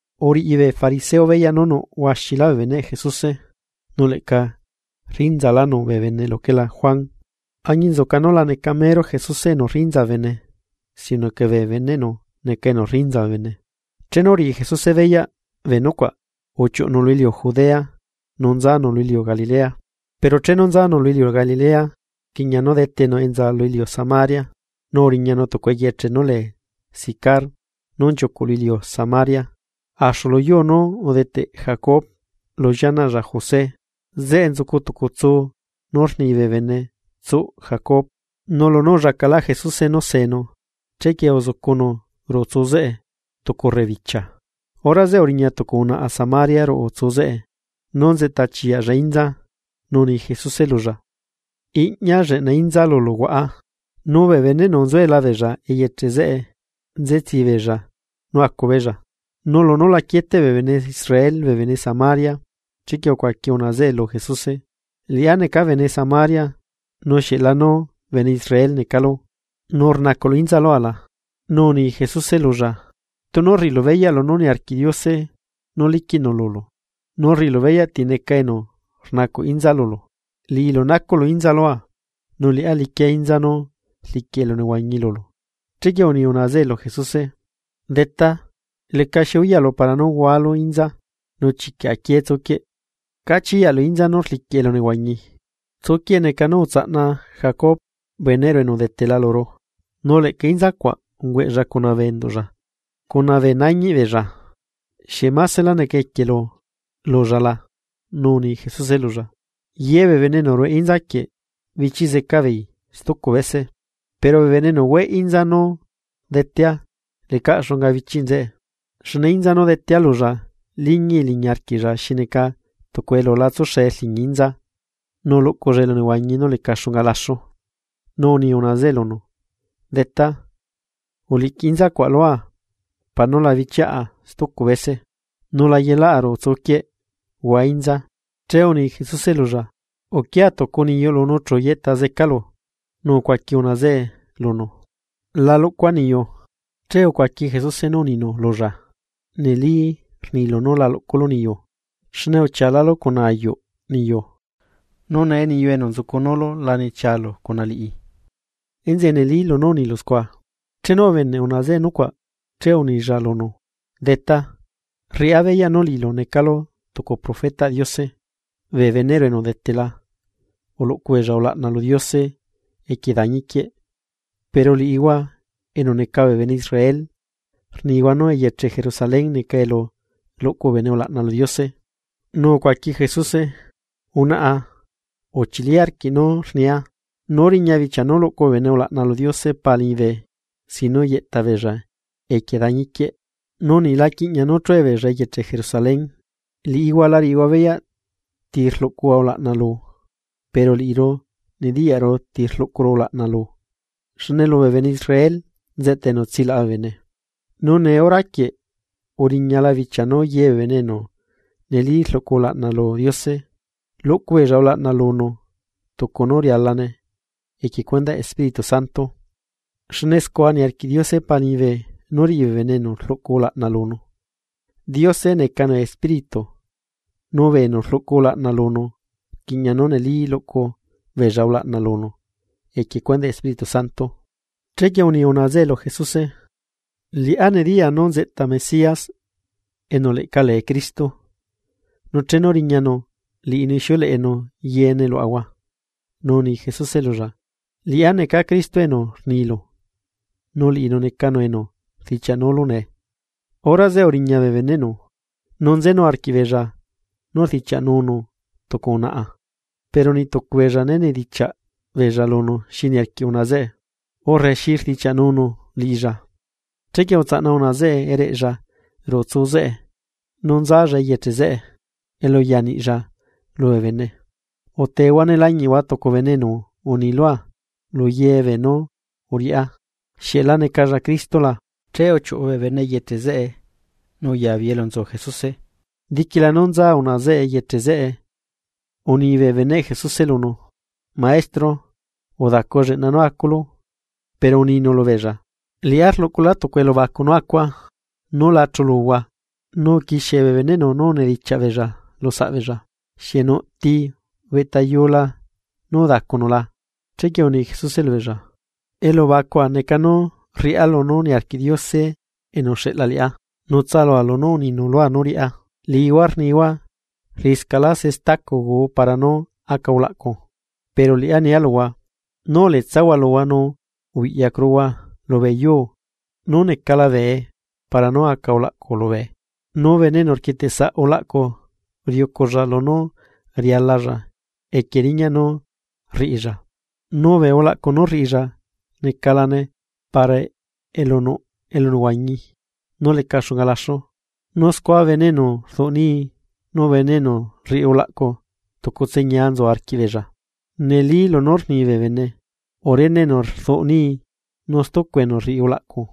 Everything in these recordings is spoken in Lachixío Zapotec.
Uriꞌi bee fariseo beyaꞌ nú nuꞌ huaxilá bee beneꞌ Jesuse, nu leꞌca rrinzalánu bee bene luquelá Juan, añinzuca nu la neca mero Jesuse enu rrinza bee bene, sino que bee beneꞌnu neca enu rriꞌnza bee bene. Chenu uriꞌi Jesuse beyaꞌ bee nucuaꞌ, uchiuꞌunu lu iliu Judea, nu nzanu lu iliu Galilea. Pero chenu nzanu lu iliu Galilea, rquiꞌña nú detenu enza lu iliu Samaria. Nu uriñanu tucu eyeche nú lee Sicar, nú nchiucuꞌ lu iliu Samaria axu lu yuu nú udeteꞌ Jacob lu llianaꞌlla José. Zeꞌe nzucu tucu tsu nú rni bee bene tsuꞌ Jacob, nu lunú ullacalaꞌ Jesuse nú seenu, chequie uzucunu ruꞌu tsu zeꞌe tucu rebibichia. Hora zeꞌe uriña tucu unaꞌa Samaria ruꞌu tsu zeꞌe nú nzeꞌta chiyaꞌlla inza nu uni Jesuse lulla: ―Iꞌña lleꞌna inza lulu huaꞌa. Nu bee beneꞌnu nzuela beella eyeche zeꞌe nzetsii beella nú acu beella. Nu lunú la quieteꞌ bee bene Israel bee bene Samaria, chequie ucuaqui unaꞌa zeꞌe lu Jesuse: ―Liꞌá neca bene Samaria, nu ¿xieꞌlanu bene Israel necalu nu rnacuꞌlu inza lua la? Nu uni Jesuse lulla: ―Tunu rriꞌilu beyaꞌ lunú niarquiꞌ Diose nú liquiꞌnu lulu, nu rriꞌilu beyaꞌ tineca enu rnacuꞌ inza lulu. Liꞌilu nacuꞌlu inza lua, nu liꞌá liquia inza nú rliquiꞌ elunehuañi lulu. Chequie uni unaꞌa zeꞌe lu Jesuse: ―Detá, lecaxi uyaꞌlu para nú hualu inza, nu chiquiꞌ aquié tsuquieꞌ, ¿cá chiyaꞌlu inza nú rliquiꞌ elunehuañi? Tsuquieꞌ neca nú utsaꞌna Jacob beneꞌru enu udetela luru, nu leꞌca inza cuaꞌ ungueꞌlla cuna bee enduꞌlla cuna bee nañiꞌbeella. ¿Xieꞌ másela neca equielu lulla la? Nu uni Jesuse lulla: ―Ye bee bene enu rueꞌ inza quieꞌ, bichiꞌ zecaꞌ beei stucu bese, pero bee enu hueꞌ inza nú detea, lecaꞌ xunga bichiꞌ nzeꞌe. Xne inza nú detea lulla liñii liñi arquiꞌlla xi neca tucu elu la tsuxe rliñi inza, nu luꞌculla elunehuañi nú leca xunga laxu. Nu uni unaꞌa zeꞌe lunu: ―Detá, uliꞌquiꞌ inza cuaꞌ lua para nú la bichiaꞌa stucu bese, nu la yelaꞌa ruꞌu tsuquieꞌ huaa inza. Che uni Jesuse lulla: ―Uquia tucu niyuꞌlu nu chu yeꞌta zecalu. Nu ucuaqui unaꞌa zeꞌe lunu: ―La luꞌcua niyu. Che ucuaqui Jesuse nú uninu lulla: ―Neli rnilu nú la luꞌculu niyu, xne uchialálu cuna ayuꞌ niyu, nu nee niyu enu nzucunulu la nechialu cuna liꞌi. Enzeꞌe neli lunú unilu scua. Chenu ubeneꞌ unaꞌa zeꞌe nucuaꞌ, che unilla lunu: ―Detá, rriꞌá beyaꞌ nú liꞌilu necalu tucu profetaꞌ Diose. Bee beneꞌru enu udetela uluꞌcu beella ulaꞌna lu Diose equie dañi quieꞌ, pero liꞌihua enu neca bee bene Israel rnihua nú eyeche Jerusalén neca elu luꞌcu bee bene ulaꞌna lu Diose. Nu ucuaqui Jesuse: ―Unaꞌa, uchili arquiꞌ nú rnia, nú riña bichia nú luꞌcu bee bene ulaꞌna lu Diose Pa liñibe sin nú yeꞌta beella equie dañi quieꞌ, nu niꞌ la quiꞌñaꞌ nú chue beella eyeche Jerusalén. Liꞌihua la riꞌihua beyaꞌ ti rluꞌcuhua ulaꞌna lu. Pero liꞌiru nediyaꞌru ti rluꞌcuru ulaꞌna lu, xne lubee bene Israel nzeꞌta enu tsilaꞌa bee bene. Nu nee horaquieꞌ, uriñala bichia nú ye bee bene enu neli rluꞌcu ulaꞌna lu Diose, luꞌcu beella ulaꞌna lunu tucu nú rialane equie cuendaꞌ Espíritu Santo. Xne scua niarquiꞌ Diose Pa liñibe nú riꞌi bee bene enu rluꞌcu ulaꞌna lunu. Diose necanu Espíritu, nu bee enu rluꞌcu ulaꞌna lunu rquiꞌña nú neli luꞌcu beella ulaꞌna lunu equie cuendaꞌ Espíritu Santo. Chequie uni unaꞌa zeꞌe lu Jesuse: ―Liꞌá nediyaa nú nzeꞌta Mesías (enu leꞌca lee Cristo), nu chenu riñanu, liꞌinu ixiuleꞌenu yeene luaꞌahua. Nu uni Jesuse lulla: ―Liꞌá neca Cristo enu rnilu, nu liꞌinu necanu enu rdichiaꞌnulu nee. Hora zeꞌe uriña bee beneꞌnu, nu nzenu arquiꞌbeella nú rdichiaꞌnunu tucu unaꞌa. Pero niꞌ tucu beella né nedichiaꞌ beella lunu xi niarquiꞌ unaꞌa zeꞌe, urre xi rdichiaꞌnunu liꞌinchu. Chequie utsaꞌna unaꞌa zeꞌe ereꞌnchu ruꞌu tsuu zeꞌe nu nzanchu eyeche zeꞌe elu uya niꞌnchu, lubee bene: ―Utehua ne lañiꞌhua tucu bene enu uni lua lu ye beenú uriꞌá. ¿Xieꞌ la necalla Cristo la? Che uchiuꞌu beei eyeche zeꞌe nu uyabeei elu nzu Jesuse. Diquila nú nza unaꞌa zeꞌe eyeche zeꞌe, uni bee beneꞌ Jesuse lunu: ―Maestro, udacu lleꞌna nú aculu. Pero uninu lubeella: ―Liꞌá rluꞌculá tucu elubacu nú acua, núla chuluhua. Nu uquixie bee beneꞌnu unidichiaꞌ beella lu saꞌbeella: ―¿Xieꞌ nuꞌti ubeꞌtayula nú udacunu la? Chequie uni Jesuse lubeella: ―Elubacua neca nú rriꞌá lunú niarquiꞌ Diose enu uxeꞌla liꞌá, nu tsalua lunú uninu lua nú riꞌá. Liꞌihua rnihua: “Rriꞌiscaꞌlá se stacu guu para nú aca ulaꞌcu.” Pero liꞌá nia luhua: Nú uletsahua luhua nu ubiꞌyacuruhua lubee yuu, nú necala bee para nú aca ulaꞌcu lubee. Nu bene enu rquietesaꞌ ulaꞌcu riuculla lunú rialalla equie riñaꞌ nú rriꞌilla. Nu bee ulaꞌcu nú rriꞌilla necalane para elu nuꞌ elunehuañi nú leca xunga laxu, nu scua bene enu rduꞌ nii nu bene enu rriꞌi ulaꞌcu tucutse ñia nzu arquiꞌbeella. Neli lunú rni bee bene: “Urene enu rduꞌ nii nu stucu enu rriꞌi ulaꞌcu.”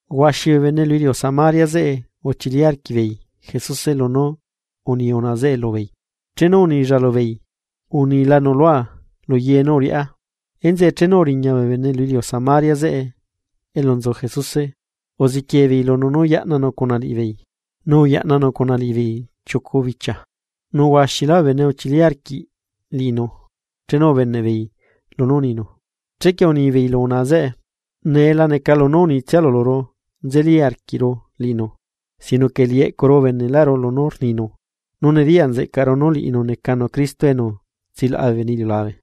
Huaxi bee bene lu iliu Samaria zeꞌe uchili arquiꞌbeei Jesuse lunú uni unaꞌa zeꞌe lubeei, chenu uninchu lubeei: “Unilanu lua luye nú uriꞌá.” Enzeꞌe chenu uriña bee bene lu iliu Samaria zeꞌe elu nzu Jesuse, uziquie beei lunu nú yaꞌnanu cuna liꞌibeei. Nu uyaꞌnanu cuna liꞌibeei chiucu bichia. Nu huaxilá bee bene uchili arquiꞌbeei liꞌinu, chenu ubeneꞌbeei lunú rninu. Chequie unibeei lu unaꞌa zeꞌe: ―Nee laneca lunú unitsialu luru nzeli arquiꞌru liꞌinu, sino que liꞌi eꞌcuru ubeneꞌlaꞌru lunú rninu, nu nediyaꞌ nzeꞌcaru nú liꞌinu necanu Cristo enu tsilaꞌa bee bene iliulabe.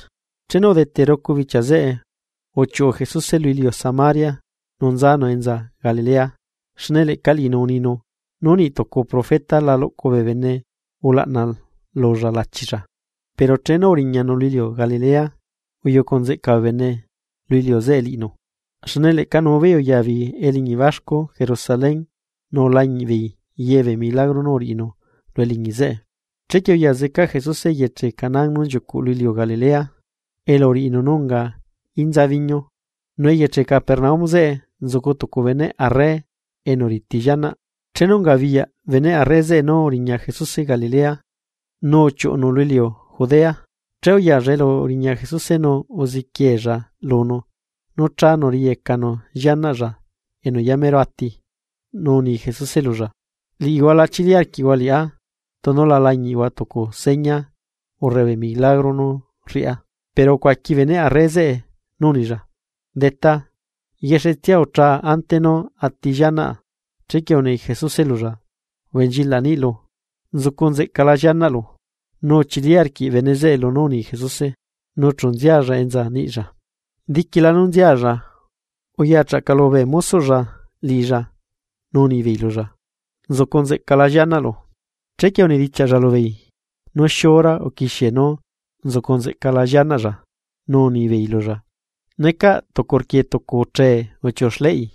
Chenu udete rucu bichia zeꞌe, uchiuꞌu Jesuse lu iliu Samaria nu nzanu enza Galilea. Xne leꞌca liꞌinu uninu, nú niꞌ tucu profeta la luꞌcu bee bene ulaꞌna lulla lachilla. Pero chenu uriñanu lu iliu Galilea, uyucu nzeꞌca bee bene lu iliu zeꞌe liꞌinu, xne leꞌca nu beei uya beei eliñi baxcu Jerusalén nu ulañiꞌ beei ye bee milagro nú uriꞌinu lu eliñi zeꞌe. Chequie uya zeca Jesuse eyeche Caná nú nchiucuꞌ lu iliu Galilea, elu uriꞌinu nú unga inza biñu. Nu eyeche Capernaum zeꞌe nzucu tucu beneꞌ arre enu riti llianaꞌ. Chenu ungabiyaꞌ beneꞌ arre zeꞌe nú uriña Jesuse Galilea, nu uchiuꞌunu lu iliu Judea. Che uyalla elu uriña Jesuse nu uziquiella lunu nú chánu riyecanu llianaꞌlla enu yamero ati. Nu uni Jesuse lulla: ―Liꞌihua la chili arquiꞌhua liꞌá tunu la lañiꞌhua tucu seña, urre bee milagro nú rriꞌá. Pero ucuaqui beneꞌ arre zeꞌe nú unilla: ―Detá, yexetsia uchaa ante nú ati llianaꞌa. Chequie uni Jesuse lulla: ―Ubenchilaꞌ niꞌlu, nzucu nzeꞌcala llianaꞌlu. Nu uchili arquiꞌ bene zeꞌe lunú uni Jesuse, nu chu nzialla enza niꞌilla. Diquila nú nzialla, uyachaꞌcalu bee mosoꞌlla liꞌilla nu unibeei lulla: ―Nzucu nzeꞌcala llianaꞌlu. Chequie unidichiaꞌlla lubeei nú xiura uquixie nú uzucu nzeꞌca llianaꞌlla, nu unibeei lulla: ―Necaꞌ tucu rqui tucu uchee uchiuꞌu xleꞌi.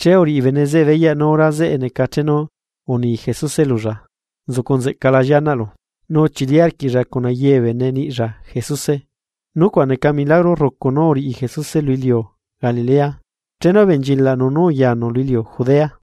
Che uriꞌi bene zeꞌe beyaꞌ nú hora zeꞌe neca chenu uni Jesuse lulla: “Nzucu nzecala llianaꞌlu”, nu uchili arquiꞌlla cuna ye bee bene niꞌlla Jesuse. Nucuaꞌ neca milagro rrucu nú uriꞌi Jesuse lu iliu Galilea, chenu ubenchilaꞌnu nú uyanu lu iliu Judea.